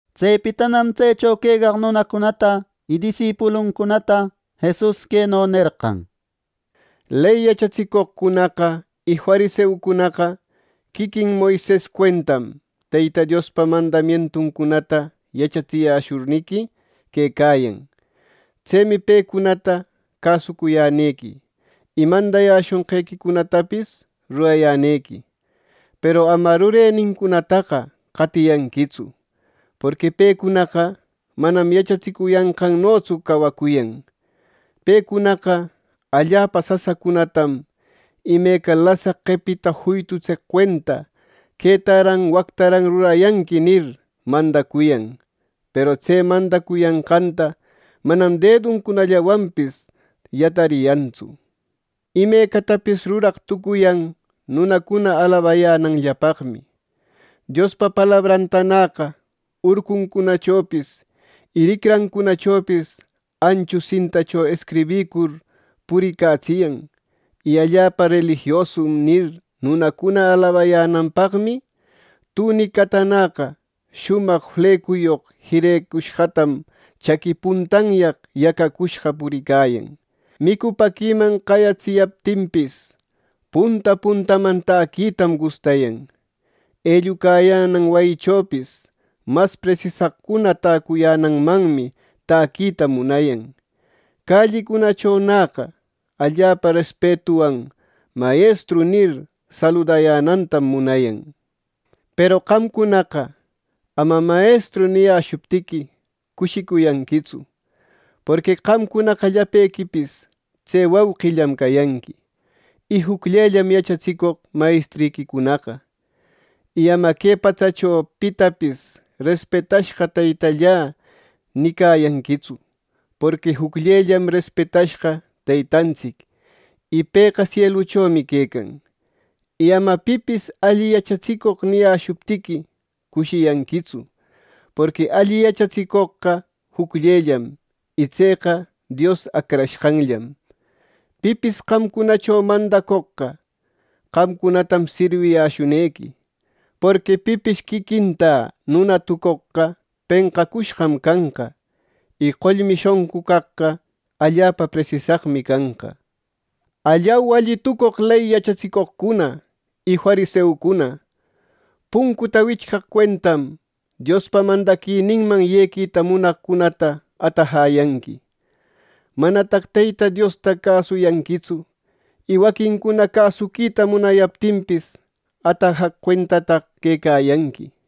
Tsepitanam tsecho quecaq nunacunata y disipuluncunata, Jesus queno nerqan: “Ley yachatsicoqcunaqa y fariseucunaqa quiquin Moises cuentam, Teyta Diospa mandamientuncunata yachatsiyäshurniqui quecayan. Tsemi pecunata cäsucuyänequi y mandayäshonqequicunatapis rurayänequi. Peru ama rurenincunataqa qatiyanquitsu. Porqui pecunaqa manam yachatsicuyanqannotsu cawacuyan. Pecunaqa allapa sasacunatam, imeca lasaq qepita juytutseq cuenta ‘Quetaran wactaran rurayänequi’ nir, mandacuyan; peru tse mandacuyanqanta manam deduncunallawanpis yatariyantsu. Imecatapis ruraq tucuyan nunacuna alabayänanllapaqmi. Diospa palabrantanäqa urcuncunachopis y ricrancunachopis anchu sintacho escribïcur puricatsiyan. Y ‘Allapa relijiosum’ nir, nunacuna alabayänanpaqmi, tunicatanäqa shumaq flecuyoq jirecushqatam chaqui puntanyaq yacacushqa puricayan Micupäquiman qayatsiyaptinpis, punta puntaman taquitam gustayan. Ellucayänan wayichopis mas presisaqcuna täcuyänanmanmi täquita munayan. Callicunachonäqa allapa respetuwan ‘Mayestru’ nir, saludayänantam munayan. “Peru qamcunaqa ama ‘Mayestru’ niyäshuptiqui, cushiyanquitsu; porqui qamcunaqa llapequipis tse wauqillam cayanqui, y jucllellam yachatsicoq mayestriquicunaqa. Y ama que patsacho pitapis ‘Respetashqa teytallä’ nicayanquitsu; porqui jucllellam respetashqa Teytantsic, y pëqa sieluchomi quecan. Y ama pipis ‘Alli yachatsicoq’ niyäshuptiqui cushiyanquitsu, porqui alli yachatsicoqqa jucllellam y tseqa Dios Acrashqanllam. Pipis qamcunacho mandacoqqa, qamcunatam sirwiyäshunequi. Porqui pipis quiquintä nuna tucoqqa penqacushqam canqa; y qollmi shonqu caqqa allapa presisaqmi canqa. “¡Allau, alli tucoq ley yachatsicoqcuna y fariseucuna! Puncuta wichqaq cuentam Diospa mandaquininman yequita munaqcunata atajäyanqui. ¡Manataq Teyta Diosta cäsuyanquitsu y waquincuna cäsuquita munayaptinpis, atajaq cuentataq quecayanqui!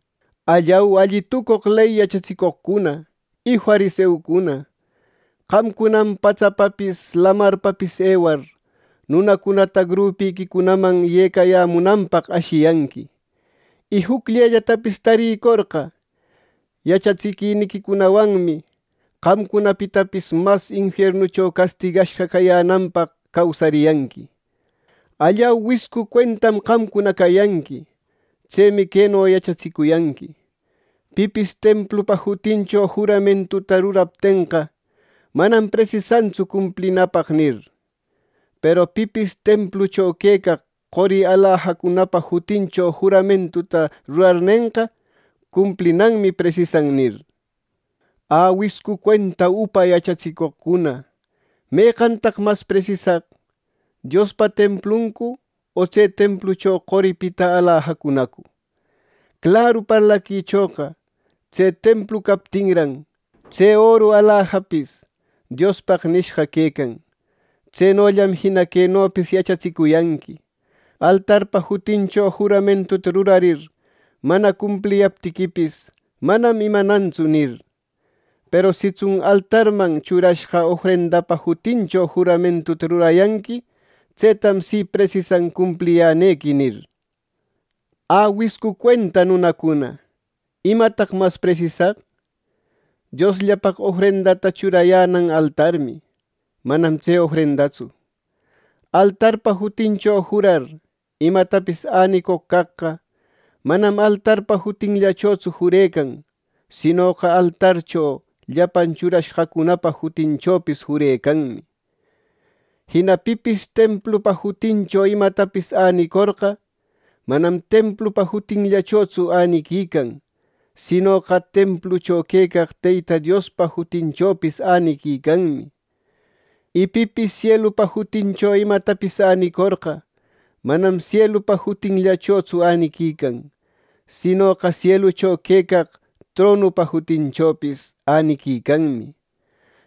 “¡Allau, alli tucoq ley yachatsicoqcuna y fariseucuna! Qamcunam patsapapis, lamarpapis ewar, nunacunata grupiquicunaman yecayämunanpaq ashiyanqui, y jucllellatapis tarïcorqa yachatsiquiniquicunawanmi qamcunapitapis mas infiernucho castigashqa cananpaq causariyanqui. “¡Allau, wiscu cuentam qamcuna cayanqui! Tsemi queno yachatsicuyanqui: ‘Pipis templupa jutincho juramentuta ruraptenqa, manam presisantsu cumplinapaq’ nir. ‘Peru pipis templucho quecaq qori alajacunapa jutincho juramentuta rurarnenqa, cumplinanmi presisan’ nir. ¡Ä, wiscu cuenta upa yachatsicoqcuna! ¿Meqantaq mas presisaq: Diospa templuncu, o tse templucho qoripita alajacunacu! Claru parlaquichoqa tse templu captinran, tse oru alajapis Diospaq nishqa quecan. Tsenollam Jina quenopis yachatsicuyanqui: ‘Altarpa jutincho juramentuta rurarir mana cumpliyaptiquipis, manam imanantsu’ nir, ‘peru sitsun altarman churashqa ofrendapa jutincho juramentuta rurayanqui, tsetam si, presisan cumpliyänequi’ nir. ¡Ä, wiscu cuenta nunacuna! ¿Imataq mas presisaq? ¡Diosllapaq ofrendata churayänan altarmi, manam tse ofrendatsu! Altarpa jutincho jurar imatapis änicoq caqqa, manam altarpa jutinllachotsu jurecan; sinoqa altarcho llapan churashqacunapa jutichopis jurecanmi. Jina pipis templupa jutincho imatapis änicorqa, manam templupa jutinllachotsu äniquican; sinoqa templucho quecaq Teyta Diospa jutinchopis äniquicanmi. Y pipis sielupa jutincho imatapis änicorqa, manam sielupa jutinllachotsu äniquican; sinoqa sielucho quecaq tronupa jutinchopis äniquicanmi.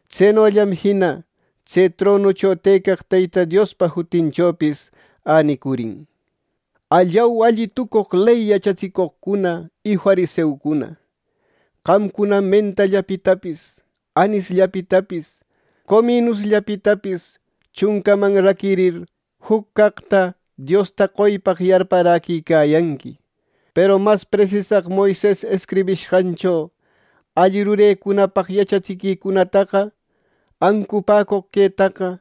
Tsenollam jina tse tronucho tëcaq Teyta Diospa jutinchopis änicurin. “¡Allau, alli tucoq ley yachatsicoqcuna y fariseucuna! Qamcunam mentallapitapis, anisllapitapis, cominusllapitapis chuncaman raquirir juc caqta Diosta qoypaq yarparäquicayanqui. Peru mas presisaq Moises escribishqancho alli rurecunapaq yachatsiquicunataqa, ancupäcoq quetaqa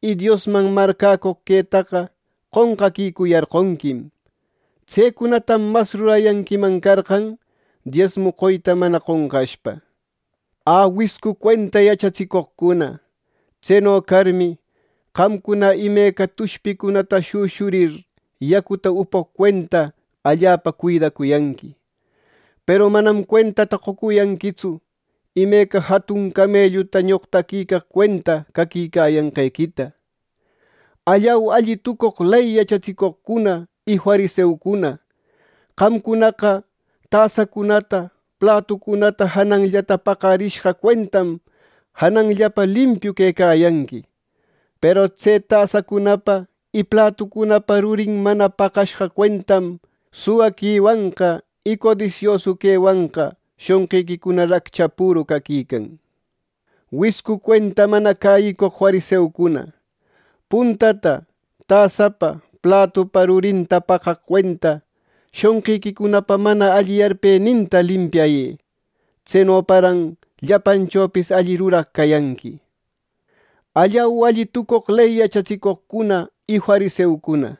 y Diosman marcäcoq quetaqa qonqaquicuyarqonquim. Tsecunatam mas rurayanquiman carqan, diesmu qoyta mana qonqashpa. ¡Ä, wiscu cuenta yachatsicoqcuna! Tseno carmi, qamcuna imeca tushpicunata shüshurir yacuta upoq cuenta, allapa cuidacuyanqui, peru manam cuentata qocuyanquitsu imeca jatun camelluta ñoqtaquicaq cuenta caquicayanqequita. “¡Allau, alli tucoq ley yachatsicoqcuna y fariseucuna! Qamcunaqa tasacunata, platucunata jananllata paqarishqa cuentam janallapa limpiu quecayanqui; peru tse tasacunapa y platucunapa rurin mana paqashqa cuentam suwaquiwanqa, y codisiosu quewanqa shonqiquicuna raccha püru caquican. ¡Wiscu cuenta mana cäyicoq fariseucuna, puntata tasapa, platupa rurinta paqaq cuenta shonqiquicunapa mana alli yarpeninta limpiayë! ¡Tsenoparan llapanchopis alli ruraq cayanqui! “¡Allau, alli tucoq ley yachatsicoqcuna y fariseucuna!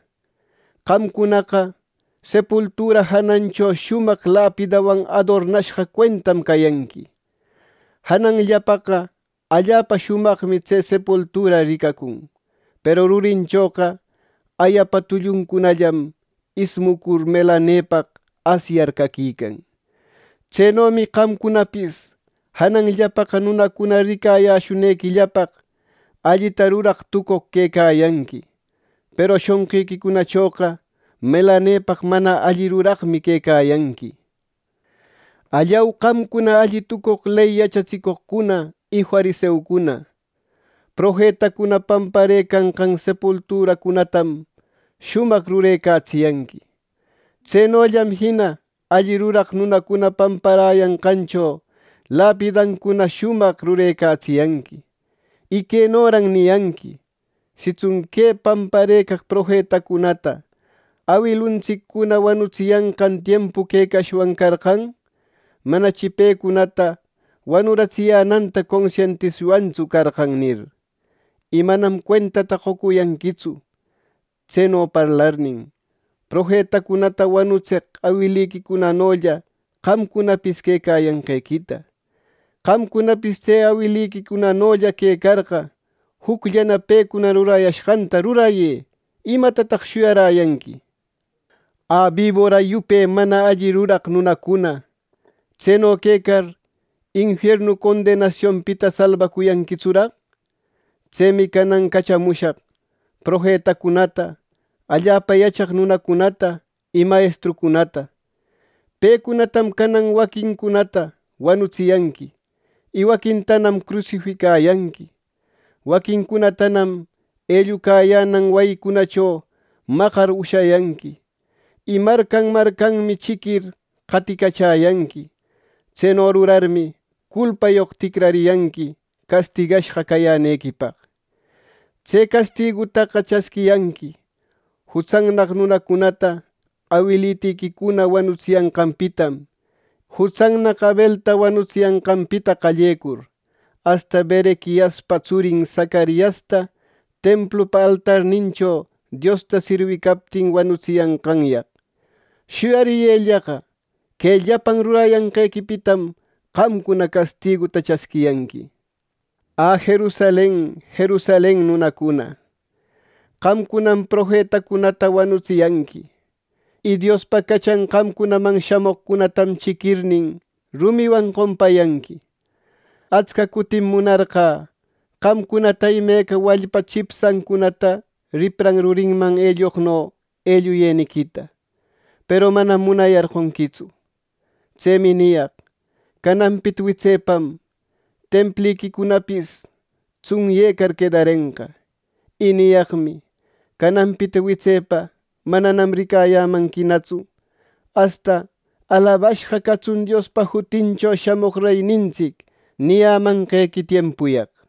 Qamcunaqa sepultura janancho shumaq lapidawan adornashqa cuentam cayanqui. Jananllapaqa allapa shumaqmi tse sepultura ricacun, peru rurinchoqa ayapa tulluncunallam, ismucur melanepaq asyacur caquican. Tsenomi qamcunapis janallapaqa nunacuna ricayäshunequillapaq allita ruraq tucoq quecayanqui. Peru shonqiquicunachoqa melanepaq mana alli ruraqmi quecayanqui. “¡Allau qamcuna, alli tucoq ley yachatsicoqcuna y fariseucuna! Profetacuna pamparëcanqan sepulturancunatam shumaq rurecatsiyanqui. Tsenollam jina alli ruraq nunacuna pamparayanqancho lapidancuna shumaq rurecatsiyanqui; y quenoran niriyanqui: ‘Sitsun que pamparëcaq profetacunata awiluntsiccuna wanutsiyanqan tiempu quecashwanna carqan, manachi pecunata wanuratsiyänanta consientishwantsu carqan’ nir. Y manam cuentata qocuyanquitsu tseno parlarnin, profetacunata wanutseq awiliquicunanolla qamcunapis quecayanqequita. ¡Qamcunapis tse awiliquicunanolla quecarqa, jucllana pecuna rurayashqanta rurayë! ¿Imatanataq shuyaräyanqui! “¡Ä, bibora yupe mana alli ruraq nunacuna! ¿Tseno quecar, infiernu condenasionpita salbacuyanquitsuraq! Tsemi canan cachamushaq profetacunata, allapa yachaq nunacunata y mayestrucunata. Pecunatam canan waquincunata wanutsiyanqui, y waquintanam crusificayanqui. Waquincunatanam ellucayänan wayicunacho maqar ushayanqui, y marcan marcanmi chiquir qaticachäyanqui. Tseno rurarmi, culpayoq ticrariyanqui castigashqa cayänequipaq. Tse castigutaqa chasquiyanqui jutsannaq nunacunata awilitiquicuna wanutsiyanqanpitam, jutsannaq Abelta wanutsiyanqanpita qallecur, asta Berequiaspa tsurin, Zacariasta templupa altarnincho Diosta sirwicaptin wanutsiyanqanyaq. Shuyariyëllaqa, que llapan rurayanqequipitam qamcuna castiguta chasquiyanqui. “¡Ä, Jerusalen, Jerusalen nunacuna! ¡Qamcunam profetacunata wanutsiyanqui y Diospa cachan qamcunaman shamoqcunatam chiquirnin, rumiwan qompayanqui! Atsca cutim munarqä qamcunata imeca wallpa chipshancunata ripran rurinman elloqno elluyeniquita; ¡Peru manam munayarqonquitsu! Tsemi niyaq: Cananpita witsepam Templiquicunapis tsunyecar quedarenqa. Y niyaqmi: Cananpita witsepa mananam ricayämanquinatsu asta ‘¡Alabashqa catsun Diospa jutincho shamoq reynintsic!’ niyamanqequi tiempuyaq.